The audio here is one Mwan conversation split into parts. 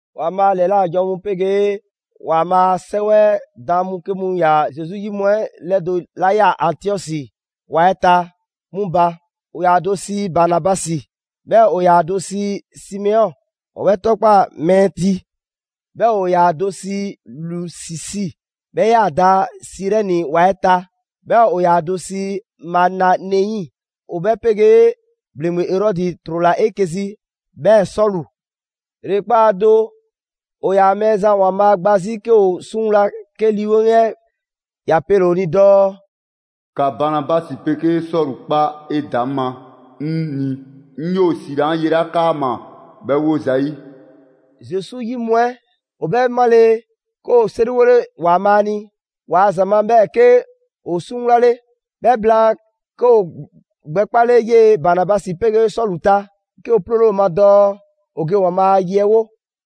‑Waanbhaa' a ‑lɛla' janwo mu 'pegee ‑Waanbhaa' a 'Sɛwɛ 'ɛ daan mu 'ke mu ‑yaa Zesu 'yi mu ‑lɛdo' 'la ꞊yaa Antiɔsi ‑wa 'ɛ ta 'mu ba: ‑o ‑yaa ‑a do sii Banabasi, 'bhɛɛ‑ ‑o ‑yaa ‑a do sii Simeɔn, ‑o 'bhɛ 'tɔkpaa‑ «Mɛɛ ti». 'Bhɛɛ‑ ‑o ‑yaa ‑a do sii Lusisi ('bhɛ 'yaa‑ da Sirɛni ‑wa 'ɛ ta), 'bhɛɛ‑ ‑o ‑yaa ‑a do sii Manaɛni (‑o 'bhɛ 'pegee ‑bhleŋgbe Erɔdi 'trola‑ 'eke‑ zi), 'bhɛɛ‑ Sɔlu. ‑Yrekpaa' do, ‑o ‑yaa Mɛɛzan ‑Waanbhaa' gba 'zi 'ke ‑o 'suŋwla, 'ke Lii 'Weŋ 'ɛ ‑ya pele‑ ‑o ni dɔɔ: «‑Ka Banabasi 'pegee Sɔlu 'kpa 'edaŋma 'ŋ ni 'ŋ ‑o ‑siila 'an ye 'la 'kaama‑ 'bhɛ 'wo ‑zayi'.» Zesu 'yi mu 'ɛ ‑o 'bhɛ 'male, 'ke ‑woo 'seriwole ‑Waanbhaa' ni ‑waa' ‑za ma, 'bhɛɛ‑ 'ke ‑o 'suŋwlale. 'Bhɛ blaan 'ke ‑woo gbɛkpale 'yee‑ Banabasi 'pegee Sɔlu ta, 'ke ‑o 'ploole ‑o ma dɔɔ ‑o ge Waanbhaa a ye 'ɛ 'wo.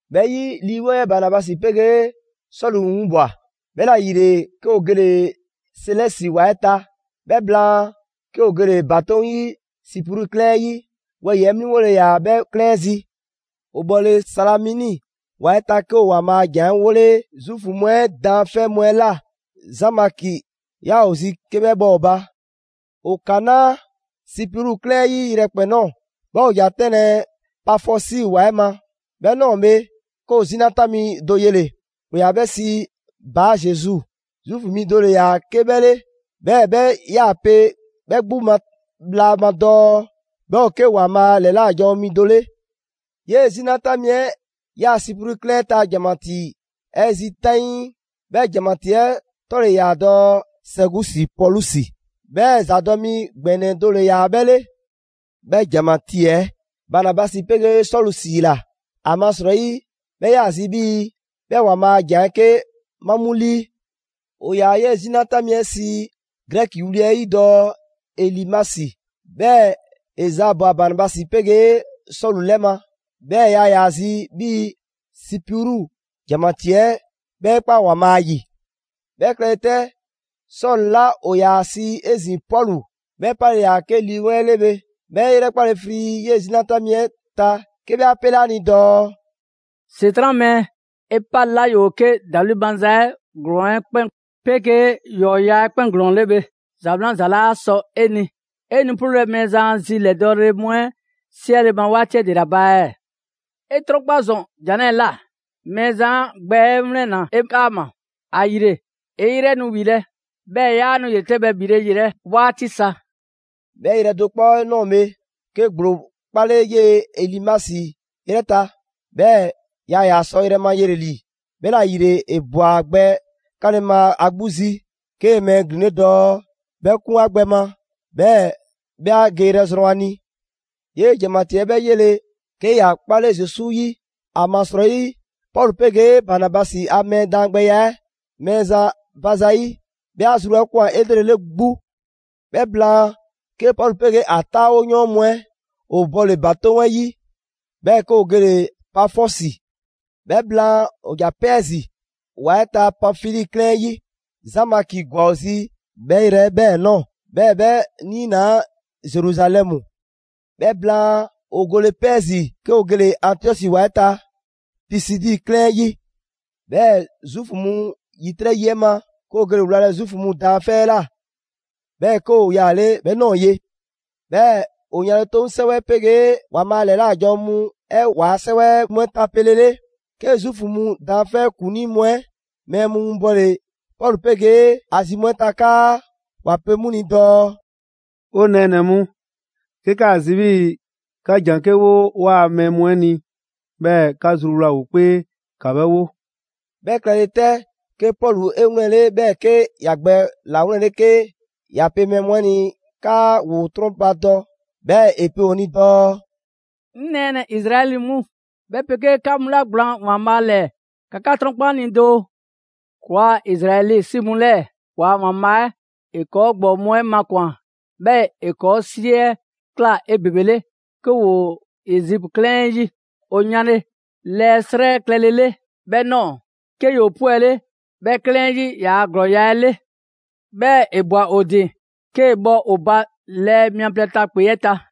'Bhɛ 'yi, Lii 'Weŋ Banabasi 'pegee Sɔlu 'winbwa‑, 'bhɛla‑ ‑yile 'ke ‑o gele‑ Selesi ‑wa 'ɛ ta. 'Bhɛ blaan, 'ke ‑o gele‑ ‑batoŋ' 'yi Sipru 'klɛɛn 'ɛ 'yi: wɛyi‑ 'mliŋgole ‑yaa 'bhɛ 'klɛɛn 'ɛ zi. ‑O bhɔle‑ Salamini ‑wa 'ɛ ta, 'ke ‑o ‑Waanbhaa' a ‑jan 'ɛ 'wole‑ Zuufu mu 'ɛ daanfɛ' mu 'ɛ ꞊la. Zaan Maki ‑yaa ‑o zi 'ke 'bhɛ bhɔ ‑o ba. ‑O kanaa' Sipru 'klɛɛn 'ɛ 'yi yrɛkpɛn‑ ꞊nɔɔ, 'bhɛɛ‑ ‑o ‑ja 'tɛnlɛ‑ Pafɔsi ‑wa 'ɛ ma. 'Bhɛ ꞊nɔɔ bhe, 'ke ‑o 'zina 'tan mi do yele‑: ‑o ‑yaa 'bhɛ sii Baa Zesu. Zuufu 'mi do 'le ‑yaa 'ke 'bhɛ 'le, 'bhɛɛ‑ 'bhɛ 'yaa‑ pe 'bhɛ 'gbu ma bhla ma dɔɔ 'bhɛ ‑o 'ke ‑Waanbhaa' ‑lɛla' janwo mi do 'le. 'Yee‑ 'zina 'tan mi 'ɛ 'yaa‑ Sipru 'klɛɛn 'ɛ ta ‑janmatii 'ɛ zi 'taŋii. 'Bhɛ ‑janmatii 'ɛ 'tɔ ‑le ‑yaa dɔɔ Sɛɛgusi Pɔlusi, 'bhɛɛ‑ ‑zadɔ' mi ‑gbɛnɛ do ‑le ‑yaa 'bhɛ 'le. 'Bhɛ ‑janmatii 'ɛ Banabasi 'pegee Sɔlu ‑siila, ‑amasrɔyi 'bhɛ 'yaa‑ zi 'bhii‑ 'bhɛ ‑Waanbhaa' a ‑jan 'ɛ 'ke 'ma 'mu 'lii. ‑O ‑yaa 'yee‑ 'zina 'tan mi 'ɛ sii Grɛki wli 'ɛ 'yi dɔɔ Elimasi; 'bhɛɛ‑ ‑e zaabwa‑ Banabasi 'pegee Sɔlu 'lɛ ma, 'bhɛɛ‑ yaa ‑yaa zi 'bhii‑ Sipru ‑janmatii 'ɛ 'bhɛ 'e 'kpa ‑Waanbhaa' 'yi. 'Bhɛ klɛle 'tɛ Sɔlu 'la, ‑o ‑yaa ‑a sii 'ezin‑ Pɔlu, 'bhɛ 'pale‑ 'la ꞊yaa 'ke Lii 'Weŋ 'ɛ 'le bhe, 'bhɛ 'e ‑yrɛkpale frii 'yee‑ 'zina 'tan mi 'ɛ ta 'ke 'bhɛ 'a 'pele 'a ni dɔɔ: «‑Setran' mɛɛ, 'e 'pale 'la ‑yoo 'ke ‑dawli' maza 'ɛ ‑glɔɔn 'ɛ 'kpɛn 'pegee ‑yɔɔya' 'ɛ 'kpɛn ‑glɔɔn 'le bhe; ‑za 'wlan za laa sɔ 'e ni! 'E nu 'ploolɛ‑ Mɛɛzan a zi ‑lɛdɔɔle mu 'ɛ 'siɛle ma 'waati 'ɛ ‑dela ba ɛɛ? 'E 'trɔnkpa ‑zɔn jan 'lɛɛ‑ ꞊la: Mɛɛzan 'a gbɛ 'ɛ 'wlɛnna‑ 'e 'kaama‑, ‑ayile 'e 'yrɛ nu ‑wilɛ', 'bhɛɛ‑ 'yaa nu ‑yretɛbhɛ ‑bhile' yelɛ 'waati sa.» 'Bhɛ yrɛ do 'kpɔ 'ɛ ꞊nɔɔ bhe, 'ke ‑gblo 'kpale 'yee‑ Elimasi 'yrɛ ta, 'bhɛɛ‑ yaa ‑yaa sɔ yrɛ ma yele‑ ‑li: 'bhɛla‑ ‑yile ‑e ꞊bwa ‑a gbɛ 'kaanle‑ ma ‑a 'gbu zi, 'kee‑ mɛɛ glin dɔɔ 'bhɛ 'kun 'a gbɛ ma, 'bhɛɛ‑ 'bhɛ ‑a geyrɛ 'ɛ zrɔn ‑a ni. 'Yee‑ ‑janmatii 'ɛ 'bhɛ 'yele‑, 'ke ‑ya 'kpale Zesu 'yi. ‑Amasrɔyi Pɔlu 'pegee Banabasi a mɛɛ daangbɛya 'ɛ Mɛɛzan ba za 'yi, 'bhɛ 'a zru 'ɛ ꞊kwan 'elrele 'gbu. 'Bhɛ blaan, 'ke Pɔlu 'pegee ‑a 'taawoyɔɔn mu 'ɛ ‑o bɔle‑ ‑batoŋ' 'yi, 'bhɛɛ‑ 'ke ‑o gele‑ Pafɔsi. 'Bhɛ blaan ‑o ‑ja Pɛɛzi ‑wa 'ɛ ta Panfili 'klɛɛn 'ɛ 'yi. Zaan Maki ‑gwa ‑o zi 'bhɛ yrɛ 'ɛ 'bhɛɛ‑ ꞊nɔɔ, 'bhɛɛ‑ 'bhɛ ‑niinaa' Zeruzalɛmu. 'Bhɛ blaan, ‑o gole Pɛɛzi, 'ke ‑o gele‑ Antiɔsi ‑wa 'ɛ ta Pisidi 'klɛɛn 'ɛ 'yi. 'Bhɛɛ‑ Zuufu mu ‑yitrɛ' yi 'ɛ ma, 'ke ‑o gele‑ wlalɛ Zuufu mu daanfɛ' 'ɛ ꞊la, 'bhɛɛ‑ 'ke ‑o yaale' 'bhɛ ꞊nɔɔ ye. 'Bhɛɛ‑ ‑o yanle 'toŋ 'sɛwɛ 'ɛ 'pegee ‑Waanbhaa' ‑lɛla' janwo mu 'ɛ ‑waa' 'sɛwɛ mu 'ɛ tapelele, 'ke Zuufu mu daanfɛ' ‑kuŋlii mu 'ɛ mɛɛ mu winbɔle Pɔlu 'pegee ‑a zi mu 'ɛ ta 'kaa ‑wa pe 'mu ni dɔɔ: «'O nɛɛnɛ‑ mu, 'ke 'kaa‑ zi 'bhii‑ 'ka ‑jan 'ke 'wo 'waa‑ mɛɛ mu 'ɛ ni 'bhɛɛ‑ 'ka zruwla ‑o 'kpee, ‑ka 'bhɛ 'wo.» 'Bhɛ klɛle 'tɛ, 'ke Pɔlu 'e 'wlɛnle‑, 'bhɛɛ‑ 'ke ‑ya gbɛ ‑lawlɛnle 'ke ‑ya pe mɛɛ mu 'ɛ ni 'kaa ‑woo 'trɔnbadɔ, 'bhɛɛ‑ ‑e pe ‑o ni dɔɔ: «'Ŋ nɛɛnɛ‑ Izraɛli mu, 'bhɛ 'pegee 'ka mu 'la 'ka gblaan ‑Waanbhaa' ‑lɛɛ, ‑ka 'ka 'trɔnkpa 'ŋ ni doo! ‑Kɔɔa' Izraɛli 'si mu 'lɛɛ‑ ‑waa' ‑Waanbhaa' 'ɛ, ‑e ‑kɔɔ' ‑gbɔɔ mu 'ɛ makwan‑, 'bhɛɛ‑ ‑e ‑kɔɔ' 'si 'ɛ ꞊kla 'ebebele, 'ke ‑woo Ezipu 'klɛɛn 'ɛ 'yi. ‑O yanle 'lɛɛ 'srɛ klɛlele 'bhɛ ꞊nɔɔ, 'ke ‑yoo 'pwɛle 'bhɛ 'klɛɛn 'ɛ 'yi ‑yaa' ‑glɔɔya' 'ɛ 'le. 'Bhɛɛ‑ ‑e ꞊bwa ‑o ‑din, 'kee‑ bhɔ ‑o ba lɛɛ mia plɛ ta ‑kpe 'ɛ ta.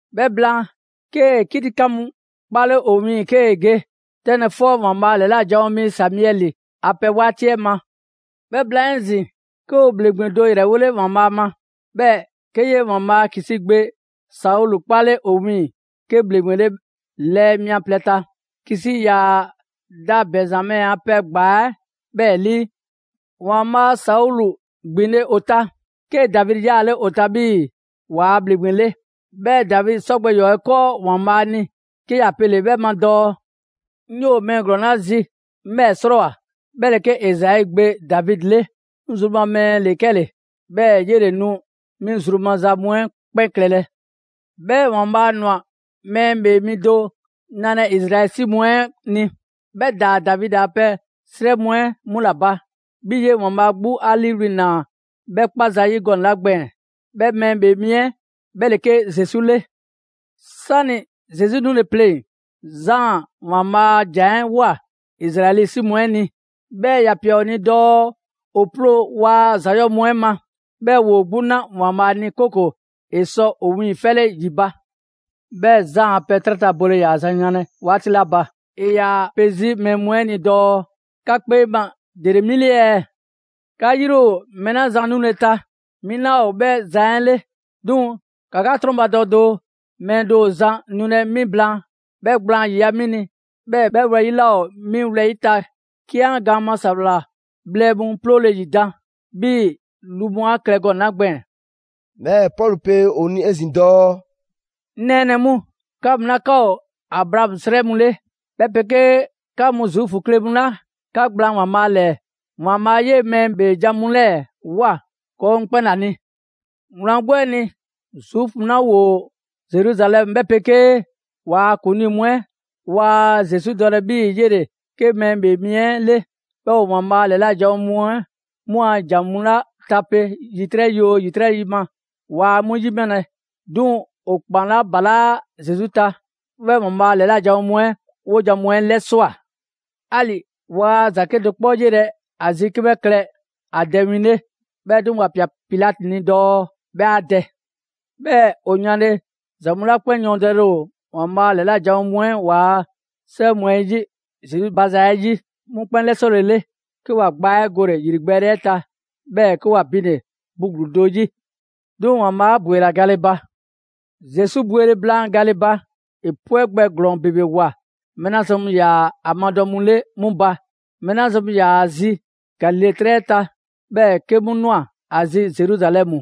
'Bhɛ blaan, 'kee‑ 'kitikan mu 'kpale ‑o wiiŋ‑ 'kee‑ ge 'tɛnlɛ‑ 'fɔ ‑Waanbhaa' ‑lɛla' janwo mi Samiɛli a pɛ 'waati 'ɛ ma. 'Bhɛ blaan 'ezin‑, 'ke ‑o ‑bhleŋgbe do ‑yrɛwole ‑Waanbhaa' ma; 'bhɛɛ‑ 'ke 'yee‑ ‑Waanbhaa' Kisi gbe Saulu 'kpale ‑o wiiŋ‑ 'ke ‑bhleŋgbe 'le lɛɛ mia plɛ ta. Kisi ‑yaa da Bɛnzamɛ a pɛ ‑gbaa 'ɛ 'bhɛɛ‑ 'lii. ‑Waanbhaa' Saulu ‑gbinle' ‑o ta, 'kee‑ Davidi 'yaale ‑o ta 'bhii‑ ‑waa' ‑bhleŋgbe 'le. 'Bhɛɛ‑ Davidi 'sɔ gbɛ ‑yɔɔ' 'ɛ 'kɔɔ ‑Waanbhaa' ni, 'ke ‑ya pele‑ 'bhɛ ma dɔɔ: ‹'Ŋ 'yoo‑ mɛɛ ‑glɔɔn 'la zi, 'ŋ 'bhɛɛ‑ 'srɔɔwoa꞊, 'bhɛ ‑le 'ke Izai gbe Davidi 'le. 'Ŋ zru ma mɛɛ ‑le 'kɛle‑, 'bhɛɛ‑ 'yele‑ nu 'mi zru maza mu 'ɛ 'kpɛn klɛlɛ.› 'Bhɛɛ‑ ‑Waanbhaa' ꞊nwa Mɛɛ ‑Bhee Mi do nalɛ Izraɛli 'si mu 'ɛ ni, 'bhɛ ‑daa Davidi a pɛ 'srɛ mu 'ɛ 'mu ‑la ba, 'bhii‑ 'yee‑ ‑Waanbhaa' 'gbu 'a 'liiwli‑ ꞊naa 'bhɛ 'kpa zayi' gɔnɛ‑ 'la gbɛɛn‑: 'bhɛ Mɛɛ ‑Bhee Mi 'ɛ 'bhɛ ‑le 'ke Zesu 'le. 'Sani‑ Zesu 'nule‑ pleŋ‑, Zaan ‑Waanbhaa' a ‑jan 'ɛ ꞊woa Izraɛli 'si mu 'ɛ ni; 'bhɛɛ‑ ‑ya ꞊pia ‑o ni dɔɔ ‑o 'ploo‑ waa ‑za 'yɔɔ‑ mu 'ɛ ma, 'bhɛɛ‑ ‑woo 'gbu na ‑Waanbhaa' ni, 'kooko‑ ‑e sɔ ‑o wiiŋfɛle ‑yi ba. 'Bhɛɛ‑ Zaan a pɛ 'trɛ ta bole ‑yaa zan yanlɛ 'waati 'la ba, ‑e ‑yaa pe 'zi mɛɛ mu 'ɛ ni dɔɔ: ‹'Ka 'kpee ma, ‑dele 'mi 'le ɛɛ? 'Ka 'yri ‑o mɛɛ 'la zan nule ta, 'mi 'laa ‑o 'bhɛ zan 'ɛ 'le. 'Duŋ‑ ‑ka 'ka 'trɔnbadɔ doo, mɛɛ do ‑o zan nulɛ 'mi blaan; 'bhɛ gblaan ‑yiya' 'mi ni, 'bhɛɛ‑ 'bhɛ wlɛyi' 'laa ‑o 'mi wlɛyi' ta 'ke 'an gaan ma ‑sawla bhlɛ mu 'ploole‑ ‑yidan' ('bhii‑ lu mu 'a klɛ gɔnɛ‑ 'la gbɛɛn‑).›» 'Bhɛɛ‑ Pɔlu pe ‑o ni 'ezin‑ dɔɔ: «'Ŋ nɛɛnɛ‑ mu, 'ka mu 'la 'ka ‑o Abraamu 'srɛ mu 'le, 'bhɛ 'pegee 'ka mu Zuufu kle mu 'la 'ka gblaan ‑Waanbhaa' ‑lɛɛ. ‑Waanbhaa' 'yee‑ mɛɛ ‑bhee jan mu 'lɛɛ‑ ꞊woa ‑kɔɔ' mu 'kpɛn ‑la ni. Wlan 'gbu 'ɛ ni, Zuufu mu 'la ‑woo Zeruzalɛmu 'bhɛ 'pegee ‑waa' ‑kuŋlii mu 'ɛ, waa Zesu dɔlɛ 'bhii‑ 'yele‑ 'ke Mɛɛ ‑Bhee Mi 'ɛ 'le; 'bhɛɛ‑ ‑o ‑Waanbhaa' ‑lɛla' janwo mu 'ɛ 'mu a ‑jan mu 'la tape ‑yitrɛ' yi oo ‑yitrɛ' ma, waa 'mu 'yimalɛ. 'Duŋ‑ ‑o kpan 'la ‑balaa' Zesu ta, 'bhɛ ‑Waanbhaa' ‑lɛla' janwo mu 'ɛ 'wojan‑ mu 'ɛ 'lɛswa꞊. 'Ali‑ waa ‑za 'kedo‑ 'kpɔ 'yelɛ‑ ‑a zi 'ke 'bhɛ klɛ ‑a dɛ win 'le, 'bhɛɛ‑ 'duŋ‑, ‑wa ꞊pia Pilati ni dɔɔ 'bhɛ 'a dɛ. 'Bhɛɛ‑ ‑o yanle ‑za mu 'la 'kpɛn yɔɔndɛle ‑o ‑Waanbhaa' ‑lɛla' janwo mu 'ɛ ‑waa 'sɛwɛ 'ɛ mu 'ɛ 'yi Zesu ba za 'ɛ 'yi, 'mu 'kpɛn 'lɛsɔlele, 'ke ‑wa gbaa 'ɛ gole‑ ‑yrigbɛɛle 'ɛ ta; 'bhɛɛ‑ 'ke ‑wa binle‑ bu ‑gluu do 'yi. 'Duŋ‑ ‑Waanbhaa' 'a ‑bwela gale ba. Zesu bwele blaan gale ba, ‑e 'pwɛ gbɛ ‑glɔɔn ‑bebe ꞊woa mɛɛ 'la zan mu ‑yaa ‑a madɔ mu 'le 'mu ba: mɛɛ 'la zan mu ‑yaa ‑a zi Galile 'trɛ 'ɛ ta, 'bhɛɛ‑ 'ke 'mu ꞊nwa ‑a zi Zeruzalɛmu.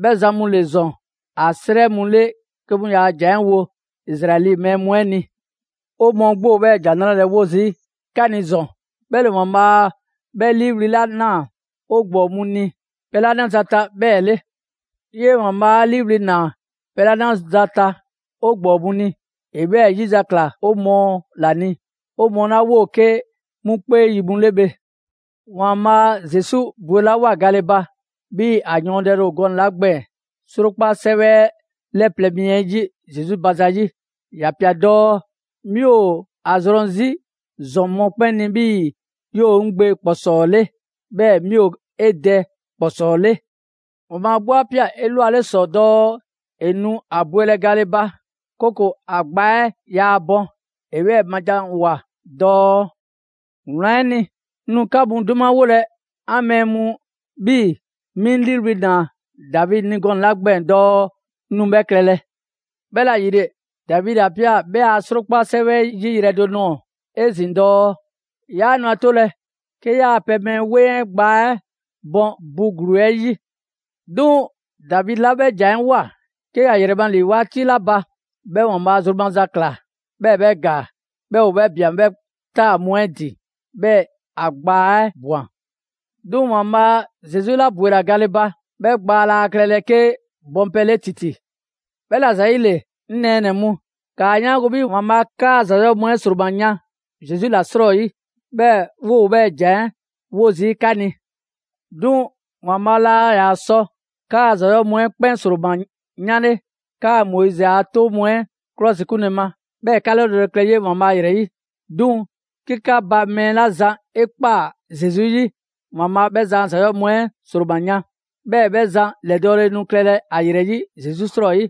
'Bhɛ zan mu ‑le ‑zɔn ‑a 'srɛ mu 'le 'ke 'mu ‑yaa' ‑jan 'ɛ wo Izraɛli mɛɛ mu 'ɛ ni. 'O mɔɔ 'gbu ‑o 'bhɛɛ‑ ‑Jan 'Nrale‑ 'ɛ 'wo zii' 'ka ni ‑zɔn: 'bhɛ ‑le ‑Waanbhaa' 'bhɛ 'liiwli‑ ‑naa 'o ‑gbɔɔ mu ni pɛ 'la 'naza‑ ta 'bhɛɛ‑ 'le. 'Yee‑ ‑Waanbhaa' 'a 'liiwli‑ ‑naa pɛ 'la 'naza‑ ta 'o ‑gbɔɔ mu ni, ‑e 'bhɛɛ‑ 'yizakla 'o mɔɔ ‑la ni, 'o mɔɔ 'la 'woo‑ 'ke 'mu 'kpee yi mu 'le bhe. ‑Waanbhaa' Zesu bwelawoa gale ba, 'bhii‑ ‑a yɔɔndɛle ‑o gɔnɛ‑ 'la gbɛɛn‑ 'Srokpa 'sɛwɛ 'ɛ 'lɛ plɛ mi 'ɛ 'yi Zesu ba zayi' ‑ya ꞊pia dɔɔ: ‹'Mi ‑o ‑a zrɔn 'zi ‑zɔn mɔkpɛn' ni 'bhii‑ 'yoo‑ 'ŋ Gbe ‑kpɔsɔɔ 'le, 'bhɛɛ‑ 'mi ‑o 'e Dɛ ‑kpɔsɔɔ 'le.› «‑Waanbhaa' 'gbu 'a ꞊pia 'elwale ‑sɔ dɔɔ ‑e nu ‑a bwelɛ gale ba, 'kooko‑ ‑a gbaa 'ɛ yaa bɔn. ‑E 'bhɛɛ‑ ma janwoa‑ dɔɔ: ‹Wlan 'ɛ ni, 'ŋ nu 'ka mu 'dumawolɛ 'an mɛɛ mu 'bhii‑ 'mi 'ŋ 'liiwli‑ ‑naa Davidi ni gɔnɛ‑ 'la gbɛɛn‑ dɔɔ 'ŋ nu 'bhɛ klɛlɛ.› «'Bhɛla‑ ‑yile, Davidi 'a ꞊pia 'bhɛ a 'Srokpa 'sɛwɛ 'ɛ 'yi yrɛ do nɔɔ‑ 'ezin‑ dɔɔ: ‹'Yaa nu 'a 'tolɛ‑ 'ke 'yaa‑ pɛ mɛɛ 'weŋ 'ɛ gbaa 'ɛ bɔn bu ‑gluu 'ɛ 'yi.› «'Duŋ‑ Davidi 'la 'bhɛ ‑jan 'ɛ ꞊woa, 'ke ‑ya ‑yrɛ ma ‑li 'waati 'la ba, 'bhɛ ‑Waanbhaa' zru maza ꞊kla; 'bhɛɛ‑ 'bhɛ ‑gaa, 'bhɛɛ‑ ‑o 'bhɛ ꞊bian 'bhɛ 'taa‑ mu 'ɛ ‑din, 'bhɛɛ‑ ‑a gbaa 'ɛ ꞊bwan. 'Duŋ‑ ‑Waanbhaa' Zesu 'la ‑bwela gale ba, 'bhɛ gbaa laa klɛlɛ 'ke bɔn pɛ 'le ‑titi. 'Bhɛla‑ ‑zayile, 'ŋ nɛɛnɛ‑ mu, ‑kaa 'yaango‑ 'bhii‑ ‑Waanbhaa' 'kaa‑ ‑za 'yɔɔ‑ mu 'ɛ ‑sroma yan Zesu ‑la 'srɔyi; 'bhɛɛ‑ 'woo‑ 'bhɛɛ‑ ‑jan 'ɛ 'wo zii' 'ka ni. 'Duŋ‑ ‑Waanbhaa' laa ‑yaa sɔ 'kaa‑ ‑za 'yɔɔ‑ mu 'ɛ 'kpɛn ‑sroma 'yanle 'kaa‑ Moizi a 'toŋ mu 'ɛ 'klɔsikunle ma, 'bhɛɛ‑ 'ka 'lɛdɔɔle klɛ 'yee‑ ‑Waanbhaa' ‑yrɛ 'yi; 'duŋ‑ 'ke 'ka ba mɛɛ 'la zan 'e ꞊kpaa Zesu 'yi, ‑Waanbhaa' 'bhɛ zan a ‑za 'yɔɔ‑ mu 'ɛ ‑sroma yan. 'Bhɛɛ‑ 'bhɛ zan ‑lɛdɔɔle nu klɛlɛ ‑a ‑yrɛ 'yi, Zesu 'srɔyi.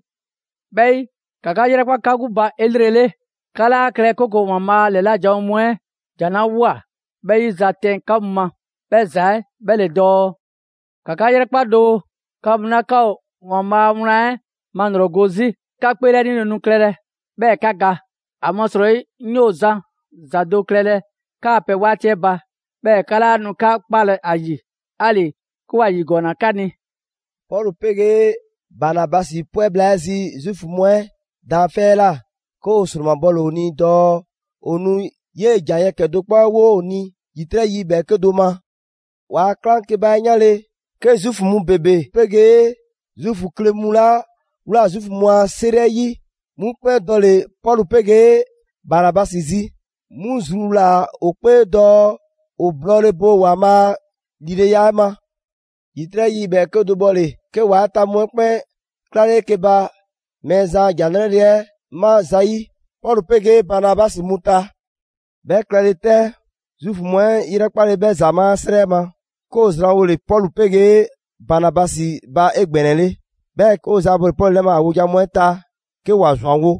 'Bhɛ 'yi, ‑ka 'ka 'yrɛkpa 'ka 'gbu ba 'elrele, 'ka 'laa klɛlɛ 'kooko‑ ‑Waanbhaa' a ‑lɛla' janwo mu 'ɛ ‑jan 'la ꞊woa, 'bhɛ 'yi ‑za 'tɛn 'ka mu ma, 'bhɛ ‑za 'ɛ 'bhɛ ‑le dɔɔ: ‹‑Ka 'ka 'yrɛkpa doo, 'ka mu 'la 'ka ‑o ‑Waanbhaa' a wlan 'ɛ malrɔgo 'zi, 'ka 'kpeelɛnile nu klɛlɛ, 'bhɛɛ‑ 'ka ga! ‑Amasrɔyi 'ŋ 'yoo‑ zan ‑za do klɛlɛ 'kaa‑ pɛ 'waati 'ɛ ba, 'bhɛɛ‑ 'ka 'laa nu 'ka 'kpalɛ‑ ‑a 'yi; 'ali‑ 'ke ‑wa ‑yigɔɔnna 'ka ni.›» Pɔlu 'pegee Banabasi 'pwɛ bhla 'ɛ zi Zuufu mu 'ɛ daanfɛ' 'ɛ ꞊la, 'ke ‑o ‑sromabɔle ‑o ni dɔɔ ‑o nu 'yee‑ ‑jan yɛkɛ‑ do 'kpɔ 'ɛ 'wo ‑o ni ‑yitrɛ' yi ‑bhɛɛke' do ma. ‑Waa' 'klaŋkeba 'ɛ 'yanle, 'ke Zuufu mu ‑bebe 'pegee Zuufu kle mu 'la ꞊wlaa Zuufu mu a 'seri 'ɛ 'yi, 'mu 'kpɛn dɔle‑ Pɔlu 'pegee Banabasi zi. 'Mu zruwlaa‑ ‑o 'kpee dɔɔ ‑o blɔɔle bo ‑Waanbhaa' a ‑lileya 'ɛ ma. ‑Yitrɛ' yi ‑bhɛɛke' do 'ɛ 'bhɔle‑, 'ke ‑wa 'ɛ ta mu 'ɛ 'kpɛn 'klale 'eke‑ ba Mɛɛzan a ‑Jan 'Nrale‑ 'ɛ 'ma zayi' Pɔlu 'pegee Banabasi mu ta. 'Bhɛ klɛle 'tɛ, Zuufu mu 'ɛ ‑yrɛkpale 'bhɛ ‑zamaa' 'srɛ 'ɛ ma, 'ke ‑o zranwole Pɔlu 'pegee Banabasi ba 'egbɛnɛle, 'bhɛɛ‑ 'ke ‑o zaabɔle Pɔlu 'lɛ ma ‑a wojan mu 'ɛ ta 'ke ‑wa ‑zwanwo'.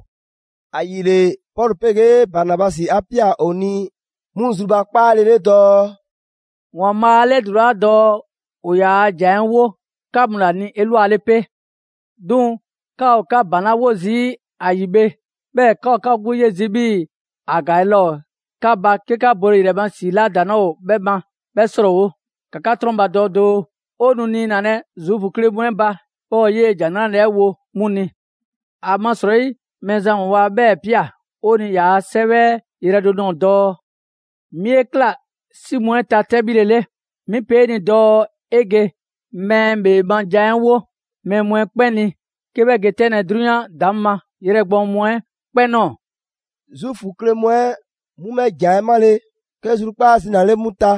‑Ayile, Pɔlu 'pegee Banabasi 'a ꞊pia ‑o ni 'mu zrubakpaale 'le dɔɔ: «‑Waanbhaa' 'a 'lɛdulaa dɔɔ ‑o ‑yaa ‑Jan 'ɛ 'wo 'ka mu ‑la ni 'elwale 'pe. 'Duŋ‑ 'ka ‑o 'ka ‑baŋ 'la 'wo zii' ‑a ‑yi bhe, 'bhɛɛ‑ 'ka ‑o 'ka 'gbu 'ye zii' 'bhii‑ ‑a ‑gaale' laa ‑o 'ka ba 'ke 'ka bole ‑yrɛ ma ‑si 'la ‑daŋ' 'laa ‑o ‑a ma 'bhɛ 'srɔɔwo‑. ‑Ka 'ka 'trɔnbadɔ doo, 'o nu niinalɛ Zuufu kle mu 'ɛ ba, 'bhɛɛ‑ 'o 'yee‑ ‑Jan 'Nrale‑ 'ɛ wo 'mu ni. ‑Amasrɔyi Mɛɛzan ‑Waanbhaa' 'bhɛɛ‑ ꞊pia 'o ni ‑yaa' 'Sɛwɛ 'ɛ yrɛ do nɔɔ‑ dɔɔ: ‹'Mi 'e ꞊kla 'si mu 'ɛ ta 'tɛbhile 'le. 'Mi pe 'e ni dɔɔ 'e ge mɛɛ ‑bhee ma jan 'ɛ 'wo mɛɛ mu 'ɛ 'kpɛn ni 'ke 'bhɛ ge 'tɛnlɛ‑ 'drunyan ‑daŋ' ma yrɛ gbɔɔn mu 'ɛ 'kpɛn ꞊nɔɔ.›» Zuufu kle mu 'ɛ 'mu 'bhɛ ‑jan 'ɛ 'male‑, 'ke zrukpaa' zinale 'mu ta,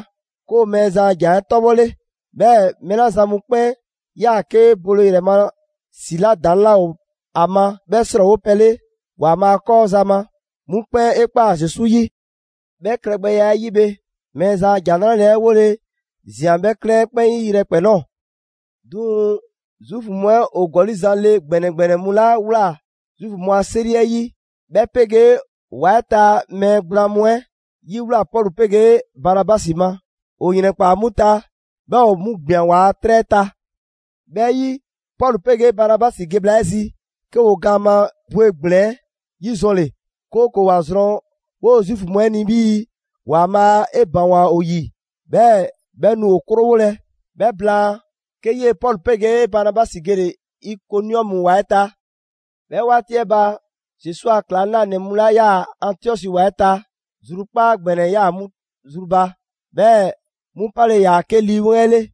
'ke ‑o Mɛɛzan a ‑Jan 'ɛ 'tɔbhɔle. 'Bhɛɛ‑ mɛɛ 'la zan mu 'kpɛn 'yaa‑ 'ke bole ‑yrɛ ma ‑si 'la ‑daŋ' 'laa ‑o ‑a ma 'bhɛ 'srɔɔwopɛ 'le ‑Waanbhaa' 'kɔɔ za ma, 'mu 'kpɛn 'e ꞊kpaa Zesu 'yi. 'Bhɛ klɛgbɛya 'ɛ yi bhe, Mɛɛzan a ‑Jan 'Nrale‑ 'ɛ 'wole‑ ꞊zian 'bhɛ 'klɛɛn 'ɛ 'kpɛn 'yi yrɛkpɛn‑ ꞊nɔɔ. 'Duŋ‑ Zuufu mu 'ɛ ‑o ‑gɔli' zan le ‑gbɛnɛ ‑gbɛnɛ mu 'la ꞊wlaa Zuufu mu a 'seri 'ɛ 'yi, 'bhɛ 'pegee ‑o ‑wa 'ɛ ta mɛɛ gblaan mu 'ɛ 'yiwlaa‑ Pɔlu 'pegee Banabasi ma. ‑O ‑yrɛnkpaa 'mu ta, 'bhɛɛ‑ ‑o 'mu ‑gbian ‑waa' 'trɛ 'ɛ ta. 'Bhɛ 'yi, Pɔlu 'pegee Banabasi ge bhla 'ɛ zi, 'ke ‑woo gaan ma bwegblɛn‑ 'yizɔnle, 'kooko‑ ‑wa zrɔn 'woo Zuufu mu 'ɛ ni 'bhii‑ ‑Waanbhaa' 'e ‑baŋgwa ‑o ‑yi, 'bhɛɛ‑ 'bhɛ nu ‑o 'krowolɛ. 'Bhɛ blaan, 'ke 'yee Pɔlu 'pegee Banabasi gele‑ Ikoniɔmu ‑wa 'ɛ ta. 'Bhɛ 'waati 'ɛ ba, Zesu a ‑klaŋlanɛ mu 'la ꞊yaa Antiɔsi ‑wa 'ɛ ta, zrukpaa' ‑gbɛnɛ ‑yaa 'mu zru ba, 'bhɛɛ‑ 'mu 'pale‑ ‑yaa 'ke Lii 'Weŋ 'ɛ 'le.